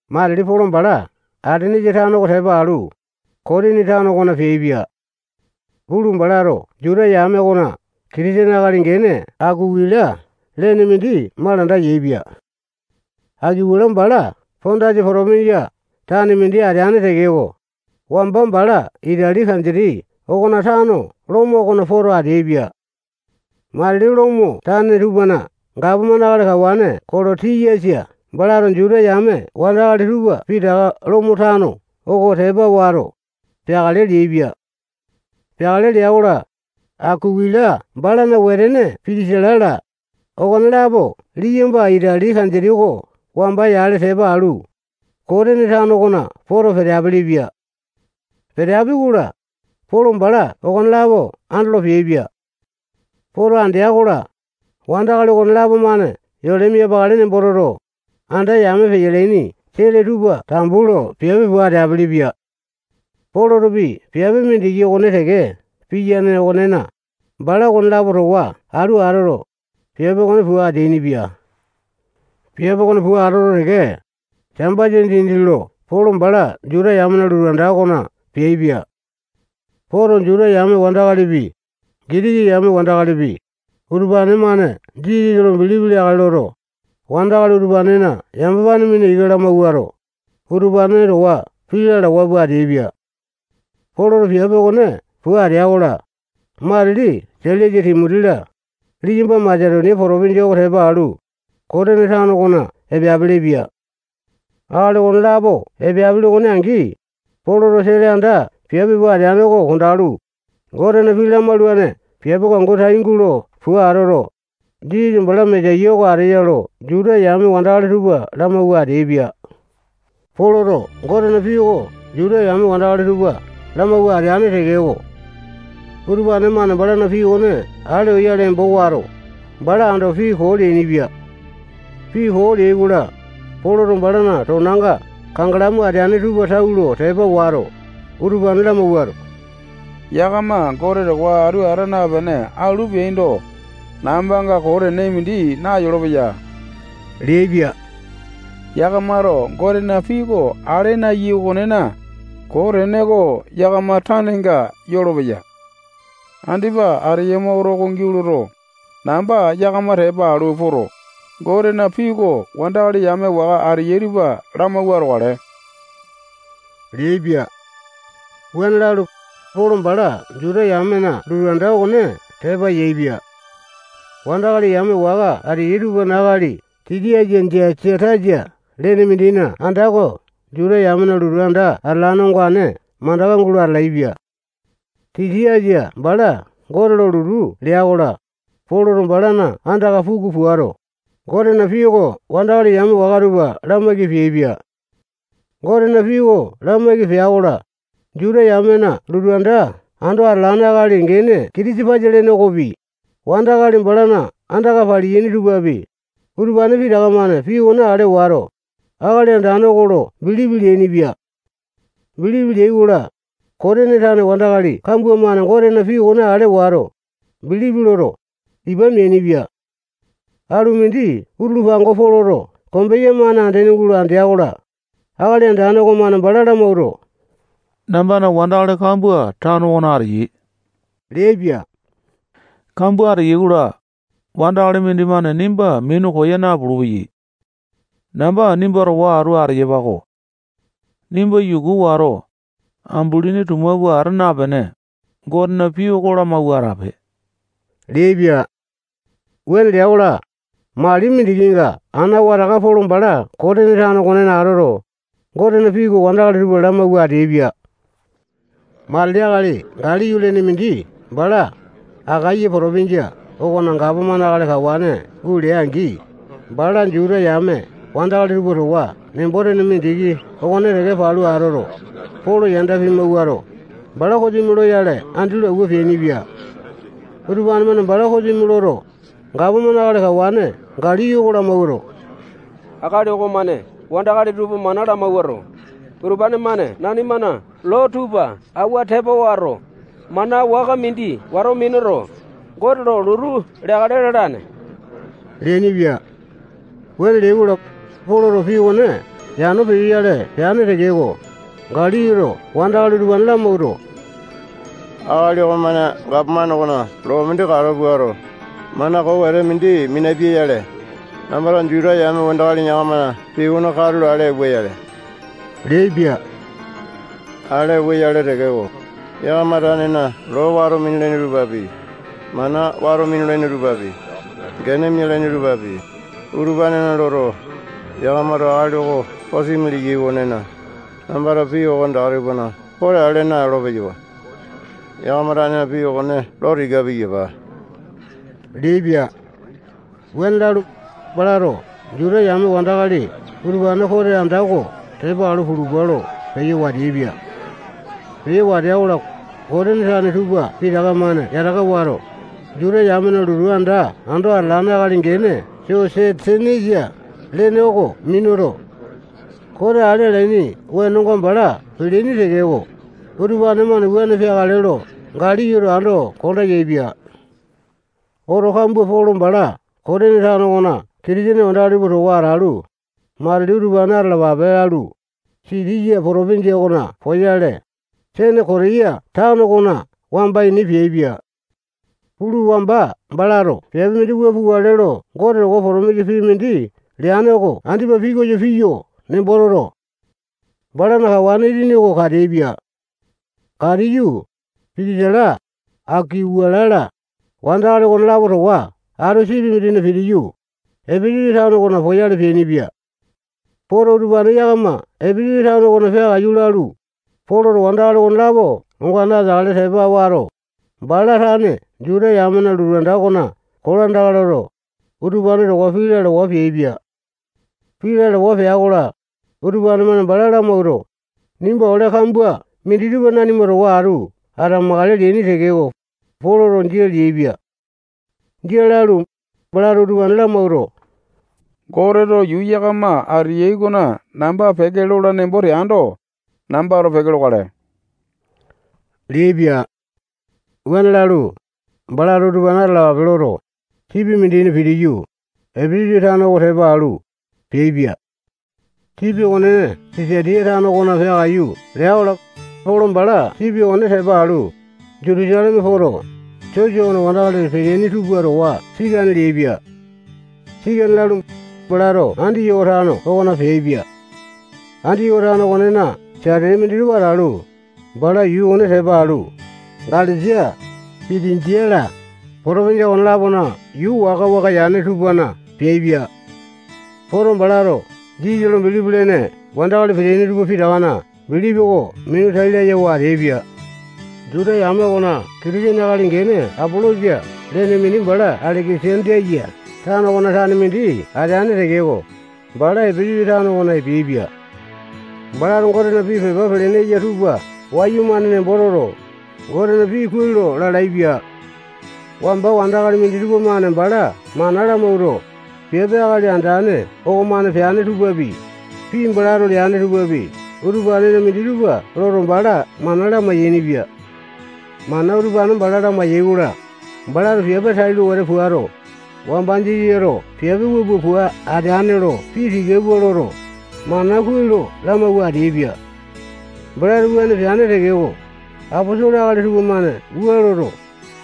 Matili Polo bala Atenesa tano oko tepa alu, Kotini tano okona peaipia. Pulu, balato Juta yame okona Kitisene akali gene Akuwila lene mindi malanda yaepia. Akuwila bala Pondasa potopinjia tane mindi ateane tekeko, wamba bala Itali kanditi okona tano Lomo okona poto ateaipia. Matili Lomo tane tupana gapomane akali kawane Kolotiyasa balato Juta yame wandakali tupa pitaka Lomo tano oko tepa wato, peakale leaipia. Peakale lea-kola, Akuwila balana wetene Pitisila-la, okonelapo liyamba Itali kanditi oko wamba yale tepa alu, Kotini tano okona poto peteapili-pia. Peteapi-kola, Polo bala okonelapo andolo peaipia. Poto andea-kola, wandakali okonelapo-mane yole miapakale nembo toto, anda yame peyalaini sele tupa tambu lo piape pua ateapili-pia. Polotopi piape mindiki okone teke piyane okonena, bala okonelapo towa atu atoto, piape okone pua ateainipia. Piape okone pua atoto teke, Sambasa dindi lo Polo bala Juta yamena lotu anda okona peaipia. Poto, Juta yame wandakalipi, Gitiki yame wandakalipi, utupane-mane Jisasa lo bilipi leakale loto, wandakali utupanena yamapane mina ika lamawuato, utupane towa pii lalawa pua ateaipia. Poloto piape okone pua atea-kola, matili Sailasa, Timoti-la, liyamba Masetonia potopinjia oko tepa alu, Kotini tano okona epeapili-pia. Akali okonelapo epeapili okone angi, Poloto sele anda piape pua ateane oko kondalu, Gotena pii lamaulane piape oko angu tai gulo pua atoto, Jisasa bala Mesaya oko ateya lo Juta yame wandakali tupa lamawua ateaipia. Poloto Gotena pii oko Juta yame wandakali tupa lamawua ateane tekeko, utupane-mane balana pii okone ale oyale embo wato, bala ando pii koo leainipia. Pii koo leai-kola, Poloto balana tonanga kangalamu ateane tupa tau lo tepa wato, utupane lamawuato, yakama Gote towa atu ata napene alu peaindo, nambanga koo tene mindi nayolopeya leaipia. Yakamato Gotena pii oko ale naeyai okonena, koo tene oko yakama tanenga yolopeya. Andipa ateyama oto oko angi atoto, namba yakama tepa alu poto, Gotena pii oko wandakali yame waka ateyai tupa lamawua atokale leaipia. Wuane lalu, Polo bala Juta yamena lotu anda okone tepa yaepia. Wandakali yame waka ateyai tupana akali Titiasa Jasatasa lene mindina anda oko Juta yamena lotu anda atalane ongane mandaka gulo atalaepia. Titiasa bala Gote lo lotu lea-kola, Poloto balana andaka puku puato, Gotena pii oko wandakali yame waka tupa lamaiki peaipia. Gotena pii oko lamaiki pea-kola, Juta yamena lotu anda ando atalane akali gene Kitisapasa lene okopi, wandakali balana andaka paleaini tupapi, utupane pitaka-mane pii okone ale wato, Akali Andane oko lo bilipi leainipia. Bilipi leai-kola, Kotini tane wandakali kambua-mane Gotena pii okone ale wato, bilipi loto, ipa meainipia. Alu mindi utulu pango Poloto kombeya-mane andene gulo andea-kola, Akali Andane okomane bala lamawuato, nambana wandakali kambua tano okona ateyai leaipia. Kambua ateyai-kola, wandakali mindimane nimba minu koya napulu-peya. Namba nimba towa atu ateyapa-ko. Nimba yuku wato, ambulini tuma pua ata napene, Gotena pii oko lamawua atape leaipia. Wuane lea-kola, mali mindikinga ana wataka Polo bala Kotini tano okonena atoto, Gotena pii oko wandakali tupa mana lamawua ateaipia. Matili akali Galiyo lene mindi bala Akaya potopinjia okona gapomane akali kawane gulea-angi, bala Juta yame wandakali tupa towa nembo-tene mindiki okone teke palu atoto, Polo yanda pimawuato, bala kosimi loyale andi lo awua peainipia. Utupane-mane bala kosimi loto, gapomane akali kawane Galiyo oko lamawuato, akali okomane wandakali tupa mana lamawuato, utupane-mane nanimana loo tupa awua tepa wato, mana waka mindi wato minuto, Gote lo lotu leakale lalane leainipia. Wuane leai-kola, Poloto pii okone yano peyoyale peane tekeko, Galiyoto wandakali utupane lamawuato, akali okomane gapomane okona loo mindi kalo puato, mana koo wete mindi minapia-yale, nambato Juta yame wandakali yakamana pii okone katulo ale auwa-yale leaipia. Ale auwa-yale tekeko, yakama tanena loo wato minulaini tupapi, mana wato minulaini tupapi, gene mialaini tupapi, utupanena loto, yakamato akali oko kosimi leyai okonena, nambato pii okonetaka tupana kote ale naolo-peyawa. Yakama tane pii okone lo tika piyapa leaipia. Wuane lalu, balato Juta yame wandakali utupane kote anda oko tepa alu pulupa lo peyo wateaipia. Peyo watea-kola, Kotini tane tupa pitaka-mane yataka wato, Juta yamena lotu anda ando atalane akali gene Sosetenesa lene oko minuto, kote ale alaini wenonga bala peleaini tekeko, utupane-mane wuane peakale lo Galiyoto ando konda yaepia. Oto kambua Polo bala Kotini tano okona Kitisene wandakali tupa towa atalu, matili utupane atalapape lalu, Sitiya potopinjia okona poyale, Senekotiya tano okona wamba ini peaipia. Pulu, wamba balato piape mindi wua pukale lo Gote towa potomisa pii mindi leane oko andipa pikoyo piyo nembo toto, balana kawane itini oko kateaipia. Katiyu, Pitisila, Akuwila-la, wandakali okonelapo towa atu sipi mindina pitiyu, Epesasa tano okona poyale peainipia. Poto, utupane yakama Epesasa tano okona peakaiyu lalu, Poloto wandakali okonelapo ongane ateakale tepa wato, bala tane Juta yamena lotu anda okona kolandaka loto, utupane towa pii lalawa peaipia. Pii lalawa pea-kola, utupane-mane bala lamawuato, nimba ole kambua minditupa nanima towa atu atamakale leaini tekeko, Poloto jia leaipia. Jia lalu, balato utupane lamawuato, Goteto yuu yakama ateyai okona namba peke lola nembo teando, nambato peke lokale leaipia. Wuane lalu, balato utupane atalapape loto, sipi mindina pitiyu, Epesasa tano oko tepa alu, peaipia. Sipi okone Sisatiya tano okona peakaiyu lea-kola, Polo bala sipi okone tepa alu, Jutusaleme poto, sosa okona wandakali peteaini tupa towa sikane leaipia. Sikane lalu, balato Andiyoko tano okona peaipia. Andiyoko tano okonena satete minditupa atalu, bala yuu okone tepa alu, Galesia, Pitinjia-la, potopinjia okone-lapona yuu waka-waka yane tupana peaipia. Poto, balato Jisasa lo bilipi lene wandakali peteaini tupa pitakana bilipi oko minu tai layawa ateaipia. Juta yame okona Kitisene akali gene Apolosa lene mindi bala Aleke-sandiya tano okona tane mindi ateane tekeko, bala Epesasa tano okona epeaipia. Balato Gotena pii pepa pelene eya tupa wayumane nembo toto, Gotena pii kuai lo lalaepia. Wamba wandakali minditupa-mane bala mana lamawuato, piape Akali Andane okomane peane tupapi, pii balato leane tupapi, utupanena minditupa loto, bala mana lamai-yainipia. Mana utupane bala lamai-yai-kola, balato piape tailo wete puato, wamba Jisasato piape wua pua ateane lo pii tika pua loto, mana kuai lo lamawua ateaipia. Balato wuane peane tekeko, aposolo akali tupamane wua loto,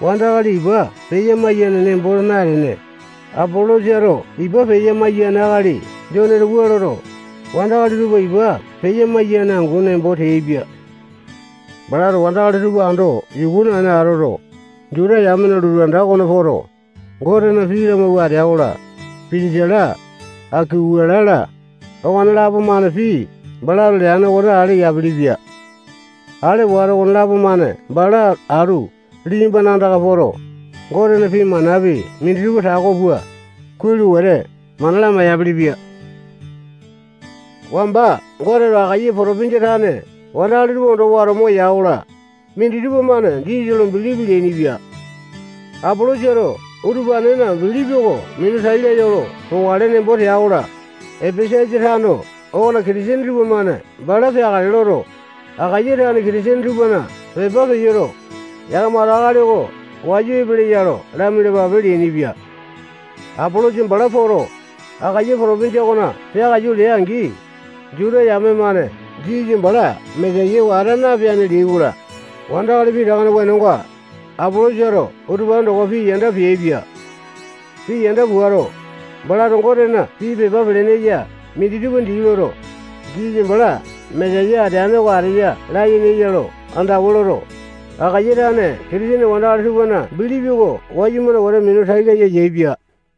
wandakali ipa peya-maiyaini nembo natene, Apolosato ipa peya-maiyane akali Joneto wua loto, wandakali tupa ipa peya-maiyane angu nembo teaipia. Balato wandakali tupa ando yuku naene atoto, Juta yamena lotu anda okona poto, Gotena pii lamawua atea-kola, Pitisila, Akuwila-la, okonelapo-mane pii balato leane okone ale yapelepia. Ale wato, okonelapo-mane bala atu liyambana andaka poto, Gotena pii manapi minditupa tako pua, kuai lo wete mana lamai-yapilipia. Wamba Goteto Akaya potopinjia tane wandakali tupa ondo wato moya-kola, minditupa-mane Jisasa lo bilipi leainipia. Apolosato utupanena bilipi oko minu tai laya olo pokale nembo tea-kola, Epesasa tano okona Kitisene tupamane bala peakale loto, Akaya tane Kitisene tupana pepa peyoto, yakamato akali oko wayu epeleya lo lamialapape leainipia. Apolosa bala poto, Akaya potopinjia okona peakaiyu lea-angi, Juta yame-mane Jisasa bala Mesaya oko ata napeane leai-kola, wandakali pitakana wenonga, Apolosato utupane towa pii yanda peaipia. Pii yanda puato, balato Gotena pii pepa pelene eya minditupa dii loto, Jisasa bala Mesaya ateane oko ateya layene eya lo andawa loto, Akaya tane Kitisene wandakali tupana bilipi oko wayumane wete minu tai laya yaepia.